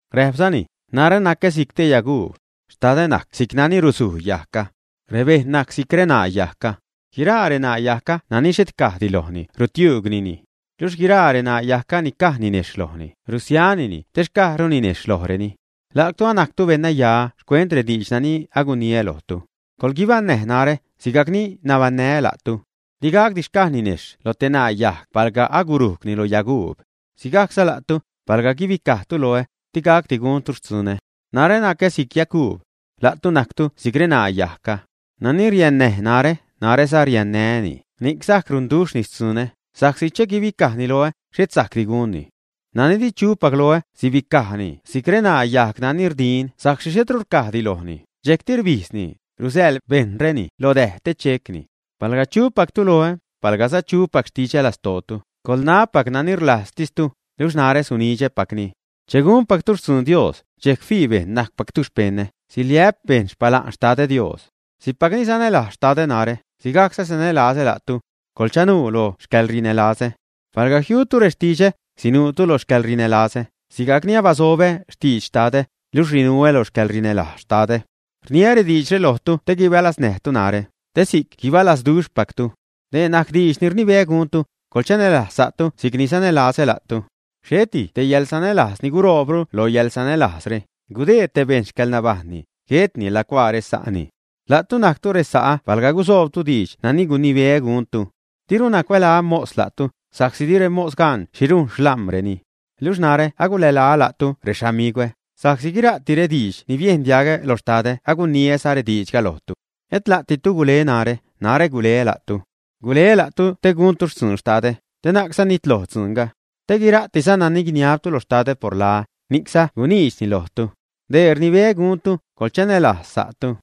Räpzani: ―Narä nacä si'c te yaguub. Xtadä najc si'c nani rusuj yajgga. Rebejṉ najc si'c reṉaa yajgga. Guiraa reṉaa yajgga nani xhet cajdi lojni rutiuugnini. Luxh guiraa reṉaa yajgga ni caj ninejxh lojni, rusianini te xcajru ninejxh lojreni. La'tu anajctu beṉnaya xcuent rediidx nani aguniä lojtu. Coḻguibaṉnäj narä, sigajc ni nabaṉnää́ la'tu. Digacdi xcaj ninejxh lo te ṉaa yajg palga agurujgni lo yaguub. Sigajcza la'tu, palga guibicajtu loä, di gacdi guntu xtzunä. ’Narä nacä si'c yaguub. La'tu najctu si'c reṉaa yajgga. Nani riannäj narä, naräza riannää́ni, ni'c sajc runduxhni xtzunä, sa'csi che guibicajni loä, xhet sajcdi gunni. Nani di chupac loä, sibicajni si'c reṉaa yajg nani rdin sa'csi xhetru rcajdi lojni, dxejcti rbijdzni, rusäḻ bejṉreni lo däj te checni. ’Palga chupactu loä, palgaza chupac xtidxä lastootu, coḻnab nani rlajztistu, luxh narä sunidxäpacni. Che gunpactu xtzun Dios, dxejc fii bejṉ najcpactu xpeṉä, siliä'p bejṉ xpala'n Xtadä, Dios. Si'cpacni sanälajz Xtadä narä, sigajcza sanälazä la'tu. Coḻchanuu lo xcäḻrinälazä. Palga jiutu rextidxä, sinuutu lo xcäḻrinälazä, sigajc ni abasobä xtidx Xtadä, luxh rinuä lo xcäḻrinälajz Xtadä. ’Rniä rediidxre lojtu te guibalaznäjtu narä, te si'c guibalazduxhpactu. Dee najc diidx ni rnibeä guntu: coḻchanälajz sa'tu si'cni sanälazätu. Xheti te yäḻsanälajz ni guroobru lo yäḻsanälajzre, gudeed te bejṉ xcäḻnabajṉni, guetni lacuaa resa'ni. La'tu najctu resa'ä palga gusoobtu diidx nani guinibeä guntu. Diruna cuälaä “mos” la'tu, sa'csi di remos gan xhi rujn xlam̲reni. Luxh narä agulälaä la'tu “rexamigwä”, sa'csi guira'ti rediidx ni biejn diagä lo Xtadä aguniäza rediidxga lojtu. Et la'ditu gule narä, narä guleä la'tu. Guleä la'tu te guntu xtzun Xtadä, te na'cza nitloj dzuunga. Te guira'tiza nani guiniabtu lo Xtadä por laä, ni'cza guniidxni lojtu. Dee rnibeä guntu: coḻchanälajz sa'tu.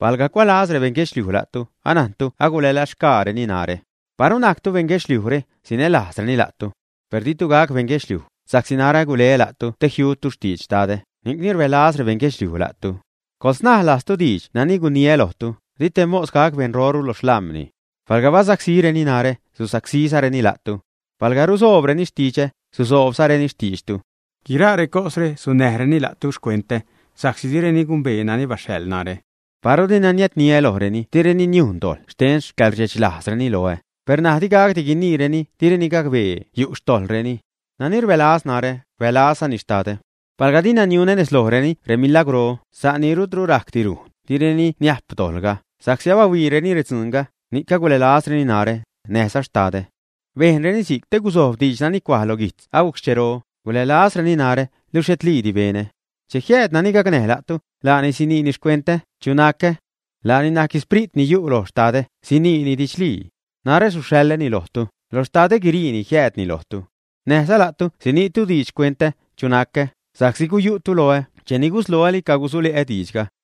’Palga cuälaz rebeṉ guedxliuj la'tu, anajntu agulälazxgaareni narä. Paru najctu beṉ guedxliujre, sinälajzreni la'tu. Per ditu gac beṉ guedxliuj, sa'csi narä guleä la'tu te jiutu xtidx Xtadä, ni'cni rbälaz rebeṉ guedxliuj la'tu. Coḻsnaj lajztu diidx nani guniä lojtu, 'di te mos gac beṉroru lo xlam̲ni'. Palga basacsíreni narä, susacsízareni la'tu. Palga rusoobreni xtidxä, susoobzareni xtiidxtu. Guiraa recosre sunnäjreni la'tu xcentä sa'csi direni gumbee nani baxhaḻ narä. ’Paru dina niädniä lojreni direni niujn dojḻ xten xcäḻrdxechlajzreni loä, per ṉaj di gacdi guiniireni direni gacbee yu' xtojḻreni. Nani rbälaz narä, rbälazzani Xtadä. Palga dina niunä nez lojreni remilagwrro, sa' nani rutru rajcdi rujn, direni niajp dojḻga; sa'csi abahuiireni redzuunga, ni'c agulälazreni narä, näjza Xtadä. Bejnreni si'c te guzojb diidx nani cuaj lo guijtz agujc xchero: “Gulälazreni narä, luxh xhetlidi benä.” ’Che jiääd nani gacnäj la'tu, laani sinii xcuentä, chu nacä. Laani najc Sprit ni yu' lo Xtadä, siniini didxlii. Narä suxhaḻäni lojtu; lo Xtadä guiriini jiäädni lojtu. Näjza la'tu siniitu diidx xcuentä, chu nacä, sa'csi guyu'tu loä cheni gusloäli cagusule'ä diidxga.